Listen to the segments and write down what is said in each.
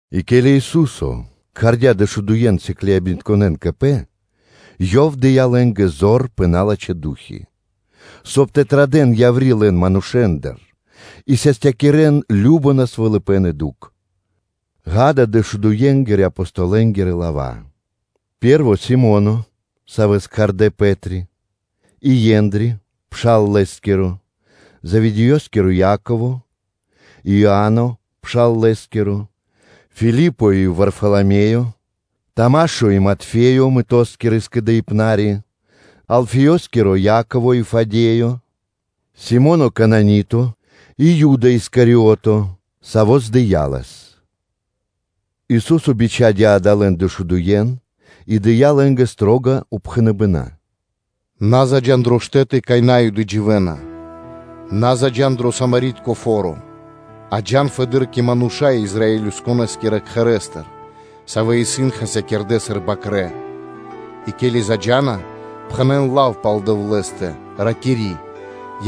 И ке́ли Ису́со кхардя́ дэшудуен сыкляибнытконэ́н кэ Пэ, Ёв дыя́ лэ́нгэ зор пэ налачхэ́ ду́хи, соб (кай) тэ традэ́н яври́ лэн манушэ́ндыр и састякирэн кажно насвалыпэн и дукх. Акэ, дэшудуенгирэ – Апостолэнгирэ лава́: пэ́рво Си́моно, савэ́с кхардэ́ Пэ́три, и Ендри (Андреё), пшал лэ́скиро, Заведеёскиро Яково, и Иа́но, пшал лэ́скиро. Филипо и Варфаламеё; Тамашо и Матфеё, мытоскиро скэдыибнари, Алфеёскиро Яково и Фадеё, Си́моно Кананито и Юда Искариото, саво́ здыя Лэс. Ису́со бичхадя́ адалэн дэшудуен и дыя́ лэ́нгэ строга упхэныбэна́: “На заджа́н дрэ штэ́ты, кай На́юды дживэ́на, на заджа́н дро Самаритянэнгиро фо́ро; а джа́н фэды́р кэ мануша́ Израилёскирэ кхэрэ́стыр, савэ́ исын хасякирдэ́ сыр бакрэ́. И ке́ли тумэ́ заджа́на, пхэнэ́н лав пал Дэвлэ́стэ, ракири́: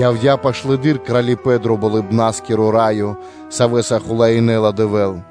‘Явдя́ пашылэды́р Кралипэ́н дро Болыбна́скиро Раё, Савэ́са хулаинэла Дэвэ́л.’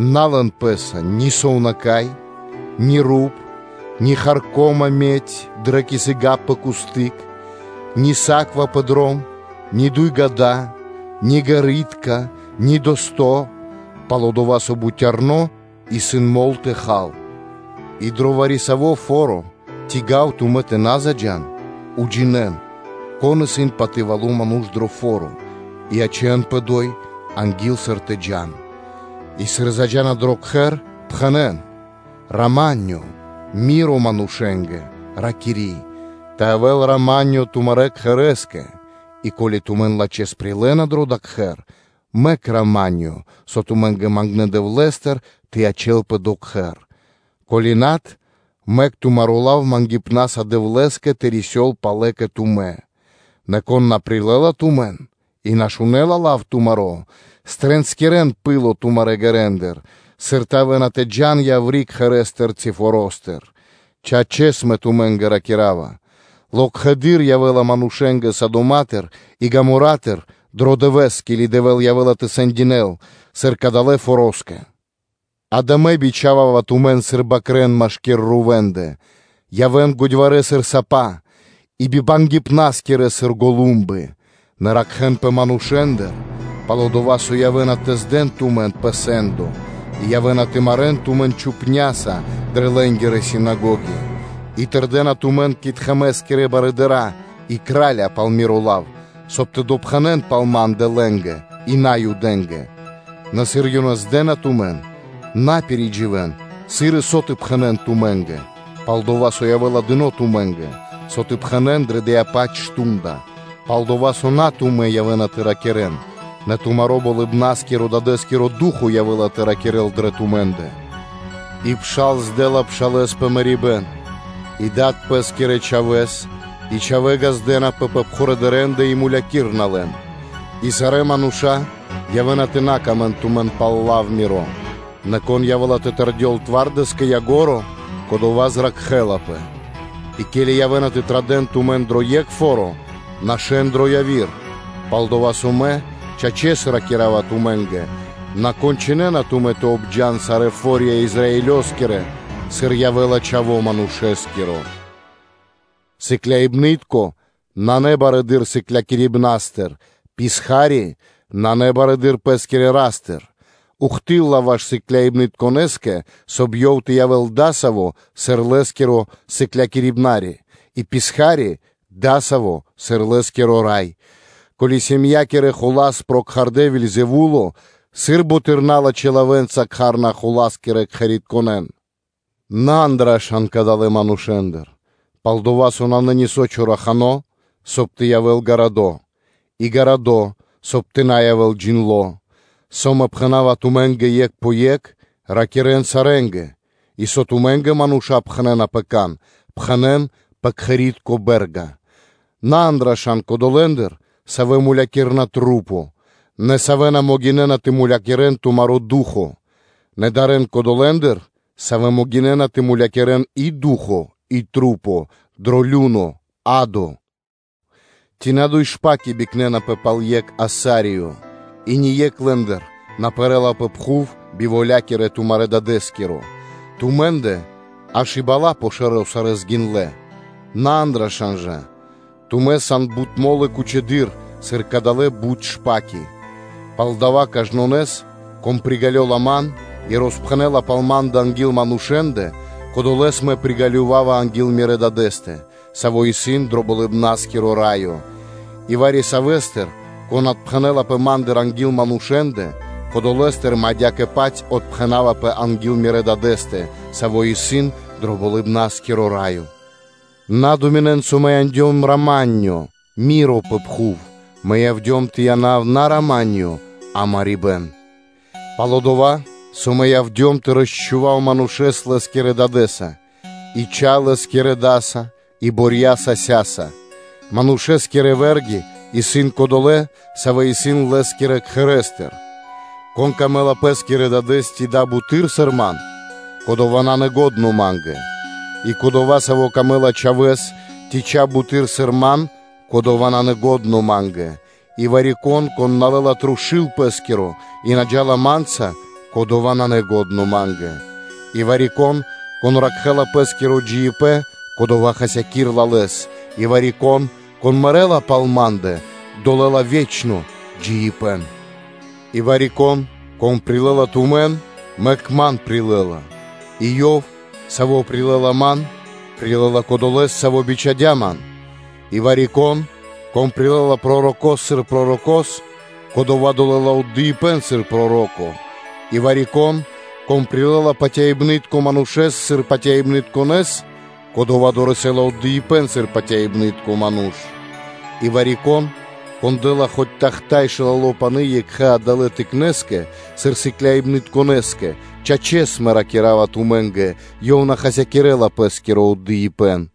На лэн пэ́са ни сувнака́й, ни руп, ни харко́ма (медь) дрэ кисыка пэ кусты́к, ни саква (сумка) пэ дром, ни дуй ґа́да, ни ґэритка, ни дэсто́. Пал-дова́ со бутярно исын мол тэ хал. И дро вари-саво́ фо́ро ци гав тумэ́ тэ на заджа́н, уджинэ́н, кон исын патывало ману́ш дро дава́ фо́ро, и ячэ́нпэ одо́й анги́л, сыр тэ джа́н. И сыр заджа́на дро кхэр, пхэнэ́н ‘рама́нё’ (миро) манушэ́скэ, ракири́: ‘Тэ явэ́л рама́нё тумарэ́ кхэрэ́скэ’; и ко́ли тумэн лачхэ́с прилэ́на дро дава́ кхэр, мэк рама́нё (миро), со тумэ́ мангнэ́ Дэвлэ́стыр, тэ ячэ́лпэ дро кхэр; ко́ли над, мэк тумаро́ лав мангипнаса Дэвлэ́скэ тэ рисёл палэ кэ тумэ́. Нэ кон на прилэ́ла тумэн и на шунэ́ла лав тумаро́, триинскирэн пыло тумарэ́ ґэрэндыр, сыр явэ́на тэ джа́н яври́ кхэрэ́стыр ци форо́стыр. Чачэс, Мэ ракира́ва тумэ́нгэ: локхэды́р явэ́ла манушэ́нгэ Содомостыр и Гомора́тыр дро дывэ́с, ке́ли Дэвэ́л явэ́ла тэ сэндинэл, сыр кадалэ́ фороскэ. Акэ, Мэ бичхава́ва тумэн сыр бакрэ́н машки́р рувэндэ; явэ́н годьварэ́ сыр сапа, и бибангипнаскирэ сыр голумбы. Нэ ракхэ́нпэ манушэ́ндыр: пал-дова́ со явэ́на тэ здэн тумэн пэ сэ́ндо, и явэ́на тэ марэ́н тумэн чупняса дрэ лэ́нгирэ синагоги; и тырдэна тумэн кэ тхэмэ́скирэ барыдыра́ и кэ кра́лья пал Миро лав, соб (кай) тэ допхэнэн пал Ма́ндэ лэ́нгэ и Наюдэ́нгэ. Нэ сыр ёнэ здэна тумэн, на пиридживэн, сыр и со тэ пхэнэ́н тумэ́нгэ: пал-дова́ со явэ́ла дыно́ тумэ́нгэ, со тэ пхэнэ́н дрэ дова́-паць мардо́ (шту́нда); пал-дова́ со дава́ на тумэ́ явэ́на тэ ракирэ́н, нэ тумаро́ Болыбна́скирэ-Дадэ́скиро Ду́хо (Фа́но) явэ́ла тэ ракирэ́л дрэ тумэ́ндэ. И пшал здэла пшалэ́с пэ мэрибэ́н, и дад пэ́скирэ чхавэ́с; и чхавэ́ ґаздэ́напэ пэ дадэндэ и мулякирэна лэн. И сарэ́ мануша́ явэ́на тэ на сыкавэ́н паты́в тумэ́нгэ пал лав Миро, нэ кон явэ́ла тэ тэрдёл твардэс кэ ко́нцо (кэ яго́ро), кодова́ зракхэ́лапэ. И ке́ли явэ́на тэ традэ́н тумэн дро екх фо́ро, нашэ́н дро яви́р; пал-дова́ со Мэ, чачэс, ракира́ва тумэ́нгэ: на кончынэна тумэ́ тэ обджан сарэ́ фо́рья Израилёскирэ, сыр явэ́ла Чхаво́ Манушэ́скиро. Сыкляибны́тко (учэнико) исын на барэды́р сыклякирибнаристыр, писха́ри (ра́бо) на барэды́р пэ́скирэ ра́стыр. Ухты́лла (до́си) ваш сыкляибнытконэскэ, соб (кай) ёв тэ явэ́л дасаво, сыр лэ́скиро сыклякирибна́скиро (учытелё), и писха́ри дасаво, сыр лэ́скиро рай. Ко́ли сэмякирэ хула́с прокхардэ Вельзэвуло, сыр бутэды́р налачхэ́ лавэ́нца кхарна хула́скирэ кхэритконэн?’ На андыршан кадалэ́ манушэ́ндыр: пал-дова́ со нанэ нисо́ чорахано, соб (кай) тэ явэ́л гарадо́, и гарадо́, соб (кай) тэ на явэ́л джиндло́. Со Мэ пхэна́ва тумэ́нгэ екх пэ екх, ракирэ́н сарэ́нгэ, и со тумэ́нгэ мануша́ пхэнэ́на пэ кан, пхэнэ́н пэ кхэри́тко бэ́рга. На андыршан кодолэндыр, савэ́ мулякирна маса́, нэ савэ́ на могинэ́на тэ мулякирэ́н тумаро́ ду́хо (фа́но); нэ дарэ́н кодолэндыр, савэ́ могинэ́на тэ мулякирэ́н и ду́хо (фа́но) и маса́ дро лю́но (адо). Ци на дуй шпаки (вороб΄и) бикнэнапэ пал екх асариё? И ни екх лэ́ндыр на пэрэ́ла пэ пхув би волякиро тумарэ́ Дадэ́скиро. Тумэ́ндэ аж и бала́ пэ шэро́ сарэ́ гиндлэ́. На андыршан жа: тумэ́ сан бут мо́лы кучэдыр, сыр кадалэ́ бут шпаки. Палдава́ кажнонэс, кон приґалёла Ман и роспхэнэ́ла пал Ма́ндэ анги́л манушэ́ндэ, кодолэ́с Мэ приґалёвава анги́л Мирэ́ Дадэ́стэ, Саво́ исын дро Болыбна́скиро Раё; и вари-савэ́стыр, кон отпхэнэлапэ Ма́ндыр анги́л манушэ́ндэ, кодолэстыр Мэ адя́кэ-паць отпхэнавапэ анги́л Мирэ́ Дадэ́стэ, Саво́ исын дро Болыбна́скиро Раё. На думинэн, со Мэ яндём рама́нё (миро) пэ пхув; Мэ явдём тэ янав на ‘рама́нё’, а марибэ́н. Пал-дова́, со Мэ явдём тэ дурьякирав манушэ́с лэ́скирэ дадэ́стыр, и чха ла́кирэ датыр, и борья сасятыр, манушэ́скирэ вэ́рги исын кодолэ́, савэ́ исын лэ́скирэ кхэрэ́стыр. Конэ́скэ исын дро́го лэ́скиро дад ци буты́р, сыр Мэ, кодова́ исын на́лачхо Ма́нгэ, и кодова́, савэ́скэ исын дро́го чхаво́ ци чхай буты́р, сыр Мэ, кодова́ исын на́лачхо Ма́нгэ, и вари-кон, кон на лэ́ла трушу́л пэ́скиро и на джа́ла Ма́нца, кодова́ исын на́лачхо Ма́нгэ, и вари-кон, кон ракхэ́ла пэ́скиро джиибэ́н, кодова́ хасякирэ́ла лэс; и вари-кон, кон мэрэ́ла пал Ма́ндэ, дорэсэ́ла ве́чно джиибэ́н. И вари-кон, кон прилэ́ла тумэн, хай, Ман прилэ́ла, и ёв, саво́ прилэ́ла Ман, прилэ́ла Кодолэ́с, Саво́ бичхадя́ Ман. И вари-кон, кон прилэ́ла пророко́с сыр пророко́с, кодова́ дорэсэ́ла (долэла) отдыибэ́н сыр проро́ко и вари-кон, кон прилэ́ла патяибнытконэ манушэ́с сыр патяибнытконэс, кодова́ дорэсэ́ла отдыибэ́н сыр патяибны́тко ману́ш. И вари-кон, кон дэ́ла хоць тахта́й (чаша) шылало пани́ екхэ́скэ адалэ́ тыкнэндыр сыр сыкляибнытконэскэ, чачэс, Мэ ракира́ва тумэ́нгэ: ёв на хасякирэ́ла пэ́скиро отдыибэ́н.”